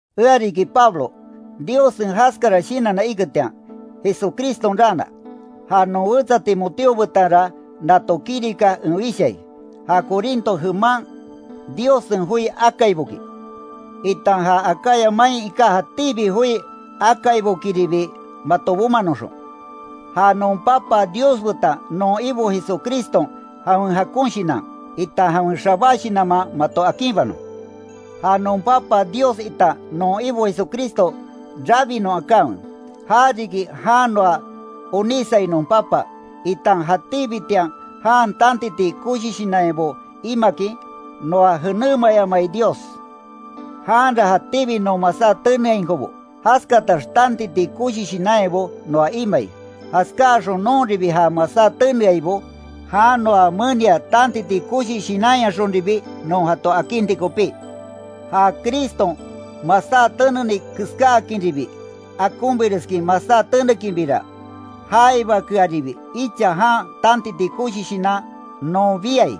Ea riki Pablo, Diossen jaskara shinanna iketian, Jesucriston raana. Ja non wetsa Timoteo betanra nato kirika en wishai, ja Corinto jeman Diossen joi akaiboki, itan ja Acaya main iká jatíbi joi akaibokiribi mato bomanoxon. Ja non Papa Dios betan non Ibo Jesucriston jawen jakon shinan, itan jawen xabá shinanman mato akinbanon. Ja non Papa Dios itan non Ibo Jesucristo rabinon akanwe, ja riki jan noa onísai non Papa, itan jatíbitian jan tantiti koshi shinanyabo imakin, noa jenémayamai Dios. Janra jatíbi non masá teneainkobo, jaskatax tantiti koshi shinanyabo noa imai, jaskáaxon nonribi ja masá teneaibo, jan noa menia tantiti koshi shinanyaxonribi non jato akinti kopí. Ja Criston masá teneni keskáakinribi, akonbireskin masá tenekinbira, jaibakearibi icha jan tantiti koshi shinan non biai.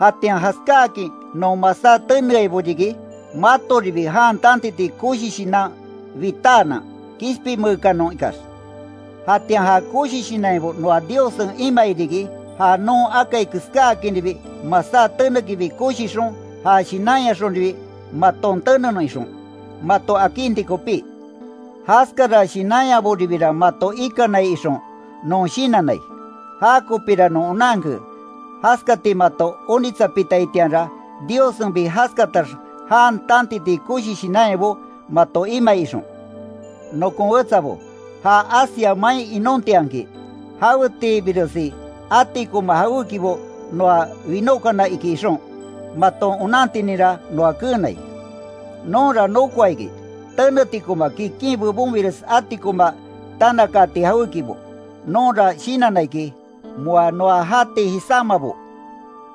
Jatian jaskáakin non masá teneaibo riki, matoribi jan tantiti koshi shinan bitaanan, kishpinmeekanon ikax. Jatian ja koshi shinanyabo noa Diossen imai riki, ja non akai keskáakinribi masá tenekinbi koshixon, ja shinanyaxonribi maton tenenon ixon, mato akinti kopí. Jaskara shinanyaboribira mato ikanai ixon, non shinannai. Jakopíra non onanke, jaskati mato onitsapitaitianra, Diossenbi jaskatax jan tantiti koshi shinanyabo mato imai ixon. Nokon wetsabo, ja Asia main inontianki, jawetiibiresi atikonma jawékibo noa winókana iki ixon, maton onantininra noa keenai. Nonra nokoa iki, tenetikoma kikin bebonbires atikonma tanakaati jawékibo; nonra shinanna iki, moa noa jati jisámabo,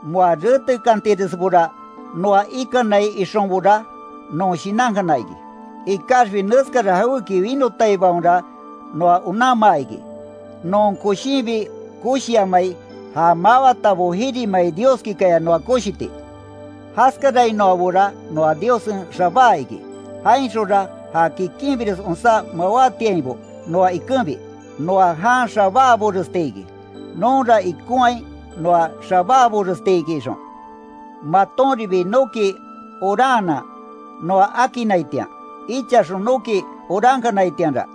moa retekantiresbora noa ikanai ixonbora, non shinankana iki. Ikaxbi neskara jawéki winotabaonra noa onanmaa iki, non koshinbi koshiamai ja mawátabo jirimai Dioskikaya noa koshiti. Jaskarainoabora noa Diossen xabáa iki, jainxonra ja kikinbires onsá mawátiainbo noa ikenbi, noa jan xabáaboresti iki. Nonra ikonhai noa xabáaborestiki ixon, matonribi noki oranhanan noa akinnaitian. Ichaxon noki orankanaitianra,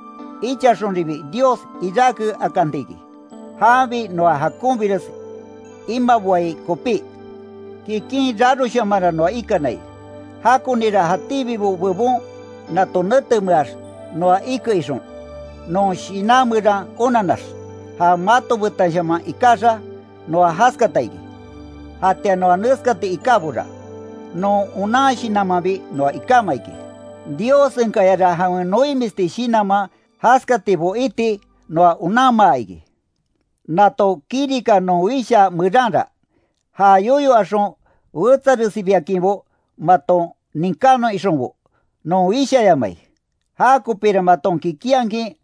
ichaxonribi Dios iráke akanti iki, janbi noa jakonbires imaboai kopí. Kikin raroshamanra noa ikanai, jakonira jatíbibo bebon nato netemeax noa ike ixon, non shinan meran onannax, ja mato betanshaman ikaxa, noa jaskata iki. Jatian noa neskati ikábora, non onan shinanmanbi noa ikáma iki, Diossenkayara jawen noimisti shinanman jaskatibo iti noa onanmaa iki. Nato kirika non wishaa meranra, ja yoyo axon wetsaresibiakinbo maton ninkánon ixonbo, non wishayamai, jakopira maton kikinhakin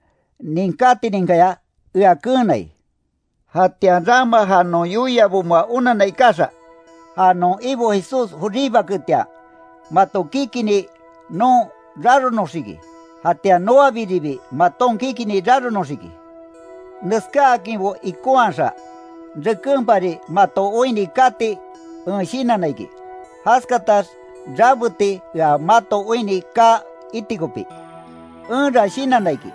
ninkátininkaya ea keenai. Jatian rama ja non yoiabo moa onanna ikaxa, ja non Ibo Jesús joribaketian, mato kikinni noon raronoxiki jatian noabiribi maton kikinni raronoxiki, Neskáakinbo ikonhaxa, rekenpari mato oinni kati en shinanna iki, jaskatax rabeti ea mato oinni kaa iti kopí. Enra shinanna iki,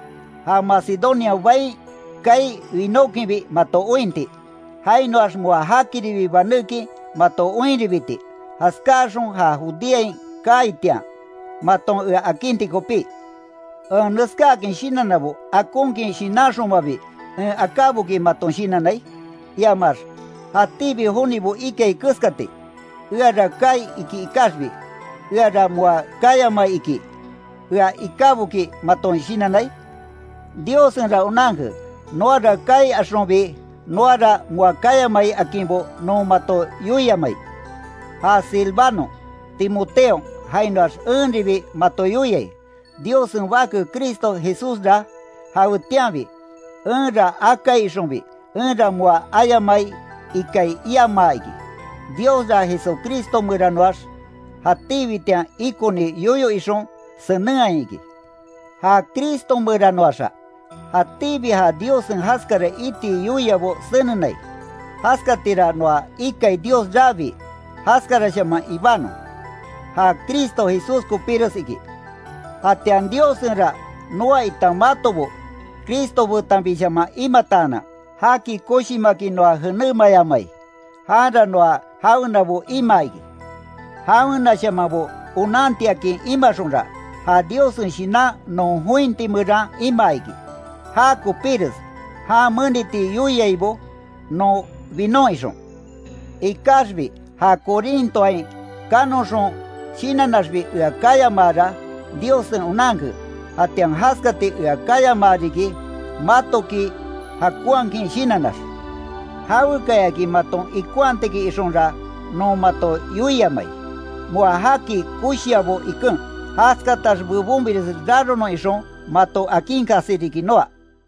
ja Macedonia bain kaai winókinbi mato ointi, jainoax moa jakiribi banékin mato oinribiti, jaskáaxon ja Judeain kaaitian, maton ea akinti kopí. ¿En neskáakin shinannabo akonkin shinanxonmabi en akáboki maton shinannai? iamax ¿Jatíbi jonibo ikai keskati “eara kaai iki ikaxbi, eara moa kayamai, iki”, ea ikáboki maton shinannai? Diossenra onanke “noara kaai axonbi noara moa kayamai akinbo non mato yoiamai”. Ja Silvanon, Timoteon jainoax enribi mato yoiai, Diossen Bake Cristo Jesúsra jawetianbi “enra akai ixonbi, enra moa ayamai ikai, iamaa iki”, Diosra Jesucristo meranoax, jatíbitian ikoni yoyo ixon, senenhai iki. Ja Cristo meranoaxa, jatíbi ja Diossen jaskara iti yoiabo senenai, jaskatira noa ikai Dios rabii, “jaskarashaman ibanon”, ja Cristo Jesús kopíres iki. Jatian Diossenra noa itan matobo Cristo betanbishaman imataanan, jaki koshimakin noa jenémayamai, janra noa jawenabo imaa iki. Jawenashamanbo onantiakin imaxonra, ja Diossen Shinan non jointi meran imaa iki, já kopíres jan meniti yoiaibo non binon ixon. Ikaxbi ja Corintoain kanoxon shinannaxbi ea kayamaara, Diossen onanke, jatian jaskati ea kayamaa riki, matoki jakonhakin shinannax. Jawekayaki maton ikonhatiki ixonra non mato yoiamai, moa jaki koshiabo iken, jaskatax bebonbires raronon ixon, mato akinkasi riki noa.